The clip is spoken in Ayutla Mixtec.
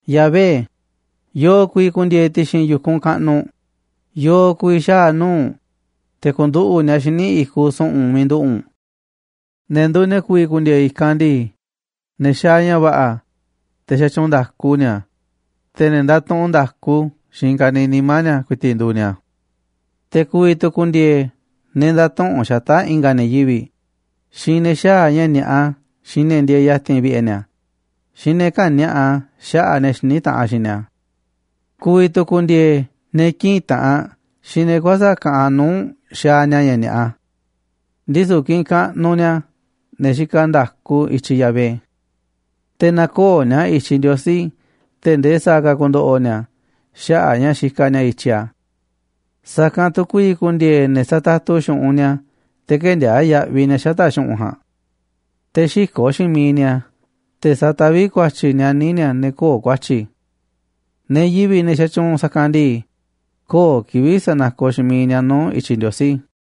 Yahvé, ¿yo̱o̱ ku̱vi̱ ku̱ndi̱e̱e̱ ti̱xi̱n yu̱kunꞌ kaꞌnuꞌ u̱nꞌ? ¿Yo̱o̱ ku̱vi̱ xaa̱ nuu̱ꞌ u̱nꞌ, te̱ ku̱nduꞌu̱ꞌ ni̱a̱ xíniꞌ i̱kuꞌ su̱ꞌu̱n miiꞌ nduꞌu̱ u̱nꞌ? Ne̱ nduuꞌ ne̱ ku̱vi̱ ku̱ndi̱e̱e̱ i̱kanꞌ ndii, ne̱ xaaꞌ ña̱ va̱ꞌa̱, te̱ xatyuunꞌ nda̱ku ni̱a̱, te̱ ne̱ ndatuꞌunꞌ nda̱ku xiinꞌ i̱i̱n ka̱niiꞌ nimá ni̱a̱ ku̱i̱ti̱ꞌ nduuꞌ ni̱a̱. Te̱ ku̱vi̱ tu̱ ku̱ndi̱e̱e̱ ne̱ ndätuꞌunꞌ xata̱ꞌ i̱nga̱ ne̱ yivi̱ꞌ, xiinꞌ ne̱ xäaꞌ ña̱ ni̱a̱ꞌa xiinꞌ ne̱ ndieeꞌ ya̱ti̱n vi̱ꞌe̱ ni̱a̱, xiinꞌ ne̱ käni̱a̱ꞌa xaꞌa̱ꞌ ne̱ xiní taꞌanꞌ xiinꞌ ni̱a̱. Ku̱vi̱ tu̱ ku̱ndi̱e̱e̱ ne̱ kïꞌinꞌ taꞌanꞌ xiinꞌ ne̱ kuäsa̱ꞌ kaꞌanꞌ nuu̱ꞌ xaaꞌ ña̱ ni̱a̱ꞌa. Ndisu̱ kiꞌinꞌ kaꞌnuꞌ ni̱a̱ ne̱ xikaꞌ nda̱ku i̱tyiꞌ Yahvé. Te̱ näkooꞌ ni̱a̱ i̱tyiꞌ Ndiosí tee̱ꞌ ndee sa̱a̱ ka̱ ku̱ndo̱ꞌo̱ ni̱a̱ xaꞌa̱ꞌ a̱ ña̱ xikaꞌ ni̱a̱ i̱tyiꞌ a̱. Sa̱kanꞌ tu̱ ku̱vi̱ ku̱ndi̱e̱e̱ ne̱ satatu xu̱ꞌunꞌ ni̱a̱ te̱ kë̱ndiaa̱ꞌ yaꞌviꞌ ni̱a̱ xata̱ꞌ xu̱ꞌunꞌ ja̱a̱nꞌ, te̱ xï̱ko̱ꞌ xiinꞌ miiꞌ ni̱a̱ te̱ sa̱taví ku̱a̱tyi̱ nianí ni̱a̱ ne̱ köo̱ꞌ ku̱a̱tyi̱. Ne̱ yivi̱ꞌ, ne̱ xatyuunꞌ sa̱kanꞌ ndii, köo̱ꞌ kivi̱ꞌ sa̱nakoꞌ xiinꞌ miiꞌ ni̱a̱ nuu̱ꞌ i̱tyiꞌ Ndiosí.